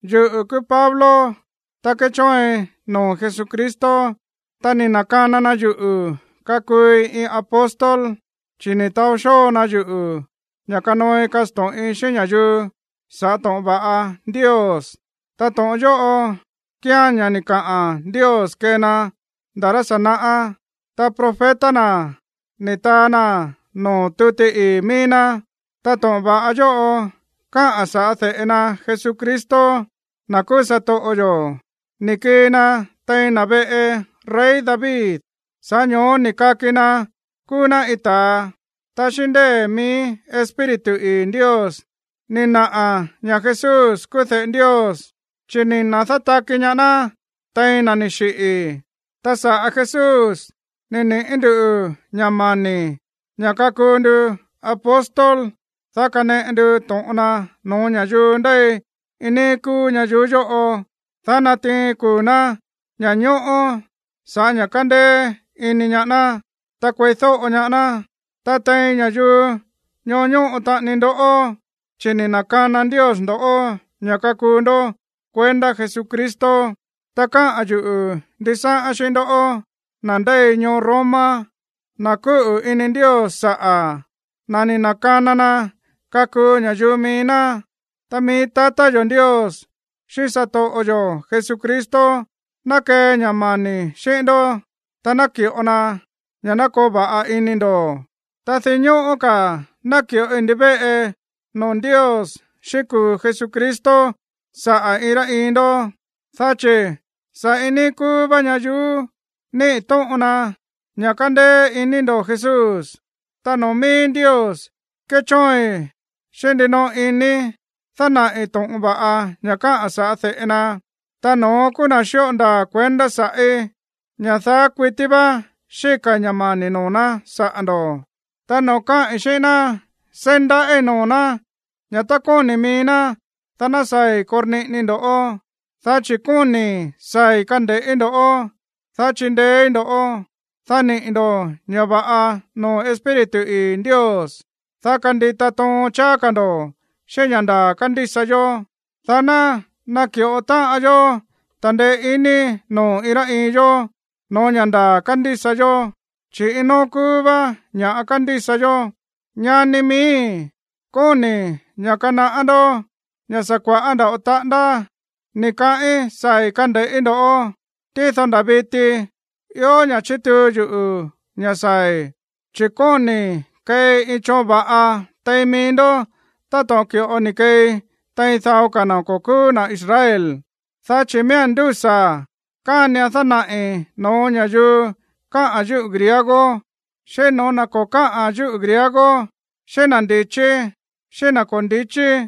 Yuꞌu̱ kúú Pablo, ta kéchóoin noo̱ Jesucristo, ta ni̱ na̱kana na yuꞌu̱ kakuui iin apóstol, chi̱ ni̱ taó xóo na yuꞌu̱ ña̱ kanooi kasto̱ꞌin xíꞌín ña̱yuu sa̱ꞌá to̱ꞌon va̱ꞌa Ndios. Ta to̱ꞌon yóꞌo kíán ña̱ ni̱ kaꞌa̱n Ndios kee na nda̱ rá sa̱ naꞌá, ta profeta na̱ ni̱ taa naa̱n noo̱ tuti ii̱ mií ná. Ta to̱ꞌon va̱ꞌa yóꞌo káꞌa̱n sa̱ꞌá de̱ꞌe na Jesucristo, na̱ kúú satoꞌo yo̱. Ni̱ kii na tein na̱ veꞌe rey David, sa̱ꞌá ño̱ó ni̱ kaki na kúú ná iin ta̱a. Ta xíꞌín ndée̱ mií Espíritu ii̱ Ndios ni̱ naꞌa̱ ña̱ Jesús kúú de̱ꞌe Ndios, chi̱ ni̱ da̱nátaki ñaá ná tein na̱ ni̱ xiꞌi̱. Ta saꞌa̱ Jesús ni̱ niꞌi̱ ndú ña̱ mani̱ ña̱ kakuu ndu apóstol, dá kaneꞌe ndu to̱ꞌon na no̱ó ña̱yuu ndéi iin níí kúú ñayuú yóꞌo, dá natiin kuu̱ ná ña̱ñóꞌó sa̱ꞌá ña̱ kandeé iní ñaá ná, ta kueídóꞌo ñaá ná. Ta tein ña̱yuu ñoó ñóꞌo taꞌani ndoꞌó, chi̱ ni̱ na̱kana Ndios ndo̱ꞌó ña̱ kakuu ndó kuendá Jesucristo. Ta káꞌa̱n yuꞌu̱ ndisáꞌán xíꞌín ndoꞌó, na̱ ndéi ñoo Roma, na̱ kúꞌu̱ ini Ndios saꞌa̱, na̱ ni̱ na̱kana na kakuu ña̱yuu mií ná. Ta mií tatá yo̱ Ndios xíꞌín satoꞌo yo̱ Jesucristo ná kee ña̱ mani̱ xíꞌín ndó, ta naki̱ꞌo na ña̱ ná koo va̱ꞌa ini ndo̱. Ta dinñóꞌó ka̱ náki̱ꞌoi ndivéꞌe noo̱ Ndios xíꞌín kuu̱ Jesucristo saꞌa̱ iin rá iin ndó, dá chi̱ sa̱ iin níí kúú vá ñayuú níꞌi̱ tóꞌon na ña̱ kándéé iní ndo̱ Jesús. Ta noo̱ mií Ndios kéchóoin xíꞌín ndinoꞌo inii̱ dánaꞌi̱ to̱ꞌon va̱ꞌa ña̱ káꞌa̱n sa̱ꞌá de̱ꞌe na, ta no̱ón kúú na̱ xíꞌo ndaa̱ kuendá sa̱ꞌí, ña̱ daá kuití vá xíka̱i̱ ña̱ mani̱ noo̱ ná saꞌa̱ ndo̱. Ta noo̱ káꞌi̱n xíꞌín ná, seí ndaꞌíi̱ noo̱ ná ña̱ tá kóni̱ mií ná, dá ná saa̱i̱ korniꞌinii ndo̱ꞌó. Dá chi̱ kóni̱i̱ saa̱i̱ kande̱ꞌí ndo̱ꞌó, ta chindeéí ndo̱ꞌó, dá niꞌi̱ ndo̱ ña̱ va̱ꞌa noo̱ Espíritu ii̱ Ndios, dá kandita toon cháá ka̱ ndo̱ xíꞌín ña̱ ndaa̱ kándísa yó, dá ná naki̱ꞌo táꞌan yó ta̱ndeé iní noo̱ iin rá iin yó no̱ó ña̱ ndaa̱ kándísa yó, chi̱ iin nóó kúú vá ña̱ kándísa yó. Ñani miíi̱, kóni̱i̱ ña̱ kanaꞌá ndó ña̱ sa̱ kua̱ꞌá nda̱ꞌo taꞌándá ni̱ kaꞌín saa̱i̱ kande̱ꞌí ndo̱ꞌó, tído nda̱ viti ió ña̱ꞌa chítuu yuꞌu̱ ña̱ saa̱i̱. Chi̱ kóni̱i̱ keei iin choon va̱ꞌa tein mií ndó táto̱ꞌon ki̱ꞌo ni̱ keei tein dao ka̱ na̱ ko̱ kúú na̱ Israel. Dá chi̱ miía̱n ndúsa̱ kánian dánaꞌi̱ no̱ó ña̱yuu káꞌa̱n yúꞌu̱ griego, xíꞌín no̱ó na̱ ko̱ káꞌa̱n yúꞌu̱ griego, xíꞌín na̱ ndi̱chí, xíꞌín na̱ ko̱ ndichí.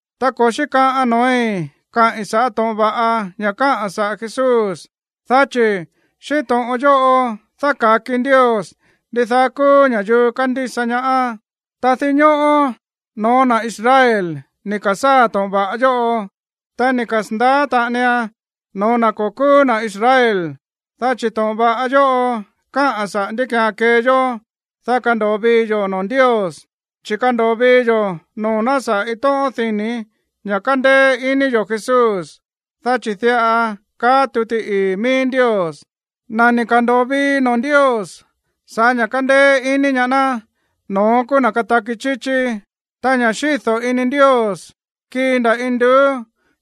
Ta ko̱ xíkaꞌan noo̱í káꞌi̱n sa̱ꞌá to̱ꞌon va̱ꞌa ña̱ káꞌa̱n saꞌa̱ Jesús, dá chi̱ xíꞌín to̱ꞌon yóꞌo dáka̱ki Ndios ndidaá kúú ña̱yuu kándísa ñaá. Ta dinñóꞌó no̱ó na̱ Israel ni̱ ka̱sáa̱ to̱ꞌon va̱ꞌa yóꞌo. Ta ni̱ kasa̱ndaá taꞌanian no̱ó na̱ ko̱ kúú na̱ Israel. Dá chi̱ to̱ꞌon va̱ꞌa yóꞌo káꞌa̱n saꞌa̱ ndí ki̱án kee yó, dá kando̱o vii yo̱ noo̱ Ndios, chi̱ kándo̱o vii yo̱ noo̱ ná sa̱ꞌá iin tóꞌón dini̱ ña̱ kándéé iní yo̱ Jesús. Dá chi̱ diꞌa kaá tuti ii̱ mií Ndios: “Na̱ ni̱ ka̱ndo̱o vií noo̱ Ndios sa̱ꞌá ña̱ kándéé iní ñaá ná, no̱ón kúú na̱ kataki chíchí.” Ta ña̱ xído̱ ini Ndios kíi nda̱ induú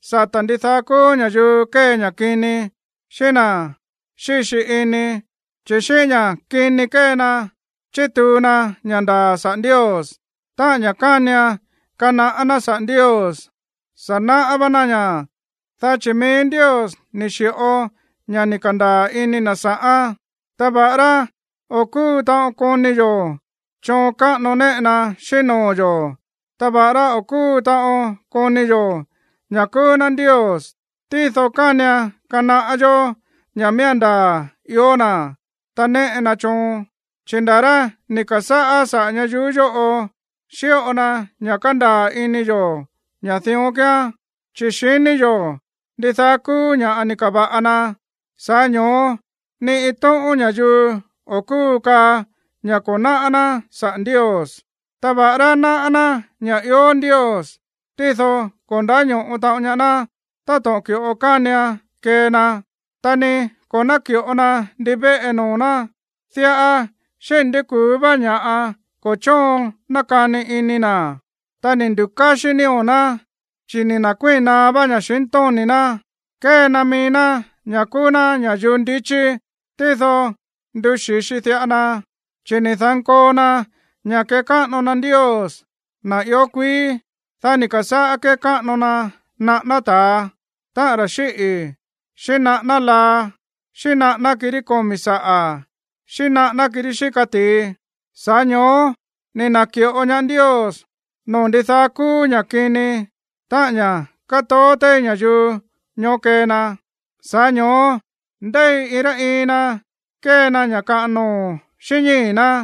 sata̱ ndidaá kúú ña̱yuu kée ña̱ kini, xíꞌín na̱ xíxi ini, chi̱ xíꞌín ña̱ kini kée na chítuu na ña̱ ndaa̱ saꞌa̱ Ndios. Ta ña̱ kánian kanaꞌá ná saꞌa̱ Ndios, sa̱ náꞌá vá ná ña̱, dá chi̱ mií Ndios ni̱ xi̱ꞌo ña̱ ni̱ ka̱ndaa̱ ini na̱ sa̱ꞌán. Ta va̱ꞌará o̱ kúu taꞌon koni yo̱ choon káꞌano néꞌe na xíꞌín noo̱ yo̱, ta va̱ꞌará o̱ kúu taꞌon koni yo̱ ña̱ kúú ná Ndios, tído kánian kanaꞌá yó ña̱ miía̱n ndaa̱ ió na̱, ta néꞌe na choon, chi̱ nda̱ rá ni̱ ka̱sáꞌá saꞌa̱ ñayuú yóꞌo xíꞌo na ña̱ kándaa̱ ini yo̱ ña̱ dión kíán, chi̱ xiní yo̱ ndidaá kúú ña̱ ni̱ ka̱va̱ꞌa na. Sa̱ꞌá ño̱ó ni iin tóꞌón ña̱yuu o̱ kúu kaa ña̱ ko̱ náꞌá ná saꞌa̱ Ndios. Ta va̱ꞌará náꞌá ná ña̱ ió Ndios, tído ko̱ ndáño̱ꞌo taꞌon ñaá ná táto̱ꞌon ki̱ꞌo kánian kee na, ta ni ko̱ náki̱ꞌo na ndivéꞌe noo̱ ná. Diꞌa xíni̱ ndi ku̱ú vá ña̱ꞌa ko̱ chóon nákani ini na̱, ta ni̱ ndu̱káxí nío̱ ná, chi̱ ni̱ na̱kuíi̱n naá vá ña̱xintóni̱ ná. Kée na mií ná ña̱ kúú ná ña̱yuu ndichí, tído ni̱ nduxi̱xi diꞌa na, chi̱ ni̱ da̱nkoo na ña̱ kekáꞌano Ndios, na̱ ió kuií. Dá ni̱ ka̱sáꞌá kékáꞌano na naꞌáná ta̱a, táꞌan ra̱ xíꞌi̱, xíꞌín naꞌáná laa, xíꞌín naꞌáná kirí komi̱ saꞌa̱, xíꞌín naꞌáná kirí xíka ti̱i. Sa̱ꞌá ño̱ó ni̱ na̱ki̱ꞌo ñaá Ndios noo̱ ndidaá kúú ña̱ kini, táꞌa̱n ña̱ kátoó téí ña̱yuu ñoó kee na. Sa̱ꞌá ño̱ó ndéi iin rá iin na kée na ña̱ kaꞌan noo̱ xíꞌín ñíi̱ ná.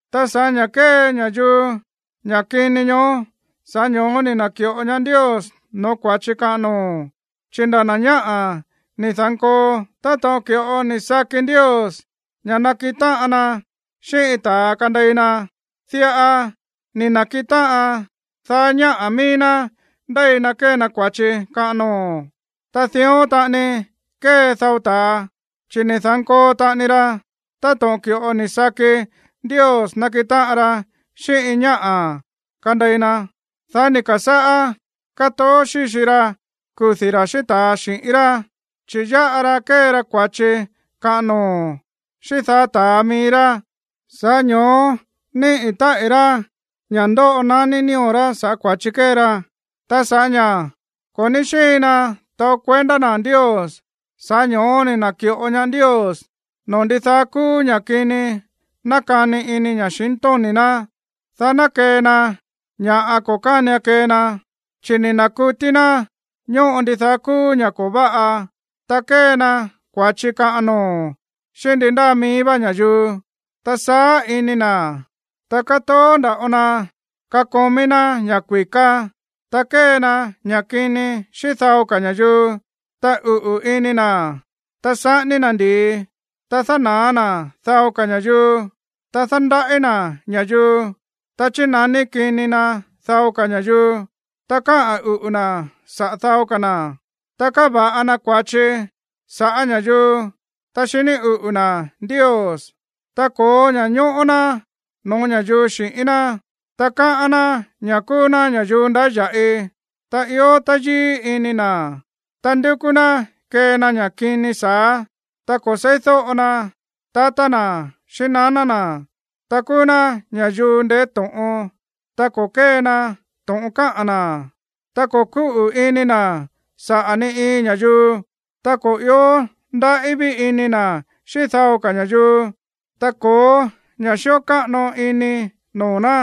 Ta sa̱ꞌá ña̱ kée ña̱yuu ña̱ kini ñoó, sa̱ꞌá ño̱ó ni̱ na̱ki̱ꞌo ñaá Ndios no̱ó kua̱chi kaꞌan noo̱. Chi̱ nda̱ na̱ ñáꞌa̱ ni̱ da̱nkoo táto̱ꞌon ki̱ꞌo ni̱ saki Ndios ña̱ nakiꞌin táꞌan na xíꞌín iin ta̱a kandei na. Diꞌa ni̱ na̱kiꞌin táꞌan daá ñáꞌa̱ mií ná ndéi na kée na kua̱chi kaꞌan noo̱. Ta dión taꞌani kée dao ta̱a, chi̱ ni̱ da̱nkoo taꞌani ra táto̱ꞌon ki̱ꞌo ni̱ saki Ndios nakiꞌin táꞌan ra xíꞌín iin ñáꞌa̱ kandei na. Dá ni̱ ka̱sáꞌá kátoó xíxi ra kudi̱ ra̱ xíꞌín ta̱a xi̱ꞌín rá, chi̱ yáꞌa ra kée ra kua̱chi kaꞌan noo̱ xíꞌín daá ta̱a mií rá. Sa̱ꞌá ño̱ó níꞌi̱ táꞌi̱ rá ña̱ ndoꞌo naní nío̱ rá sa̱ꞌá kua̱chi kée ra. Ta sa̱ꞌá ña̱ ko̱ ní xíin na taó kuendá na̱ Ndios, sa̱ꞌá ño̱ó ni̱ na̱ki̱ꞌo ñaá Ndios noo̱ ndidaá kúú ña̱ kini nákani ini ña̱xintóni̱ ná, dá ná kee na ña̱ ko̱ kánian kee na. Chi̱ ni̱ na̱kutí ná ñóꞌo ndidaá kúú ña̱ꞌa ko̱ váꞌa, ta kée na kua̱chi kaꞌan noo̱ xíꞌín ndi ndáa mií vá ña̱yuu, ta saá ini na̱, ta kátoó nda̱ꞌo na kakomí ná ña̱ kui̱ká, ta kée na ña̱ kini xíꞌín dao ka̱ ña̱yuu, ta uꞌu̱ ini na̱, ta saꞌání na̱ ndi̱i, ta dána̱á na̱ dao ka̱ ña̱yuu, ta dándaꞌí na̱ ña̱yuu, ta chínaní kini na dao ka̱ ña̱yuu, ta káꞌa̱n uꞌu̱ na̱ saꞌa̱ dao ka̱ na̱, ta káva̱ꞌa na kua̱chi sa̱ꞌá ña̱yuu, ta xiní uꞌu̱ na̱ Ndios, ta ko̱ó ña̱ñóꞌó ná no̱ó ña̱yuu xi̱ꞌín ná, ta káꞌán ná ña̱ kúú ná ña̱yuu ndáya̱ꞌi, ta ió táyíí ini na̱, ta ndúkú ná kee na ña̱ kini sa̱á, ta ko̱ seídóꞌo na tatá na̱ xíꞌín naná na̱, ta kúú ná ña̱yuu ndeé to̱ꞌon, ta ko̱ kée na to̱ꞌon káꞌa̱n na̱, ta ko̱ kúꞌu̱ ini na̱ saꞌa̱ ni iin ña̱yuu, ta ko̱ ió ndaꞌí ví ini na̱ xíꞌín dao ka̱ ña̱yuu, ta ko̱ó ña̱ xíꞌo káꞌano ini noo̱ ná.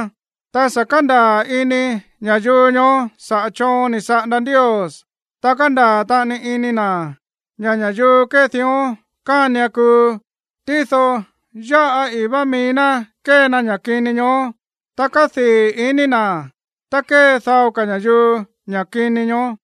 Ta sa̱ kándaa̱ ini ña̱yuu ñoó saꞌa̱ choon ni̱ saꞌanda Ndios, ta kándaa̱ taꞌani ini na̱ ña̱ ña̱yuu kée dión kánian kuu. Tído yáꞌa ii̱ vá mií ná kée na ña̱ kini ñoó, ta kádii̱ iní na̱ tá kée dao ka̱ ña̱yuu ña̱ kini ñoó.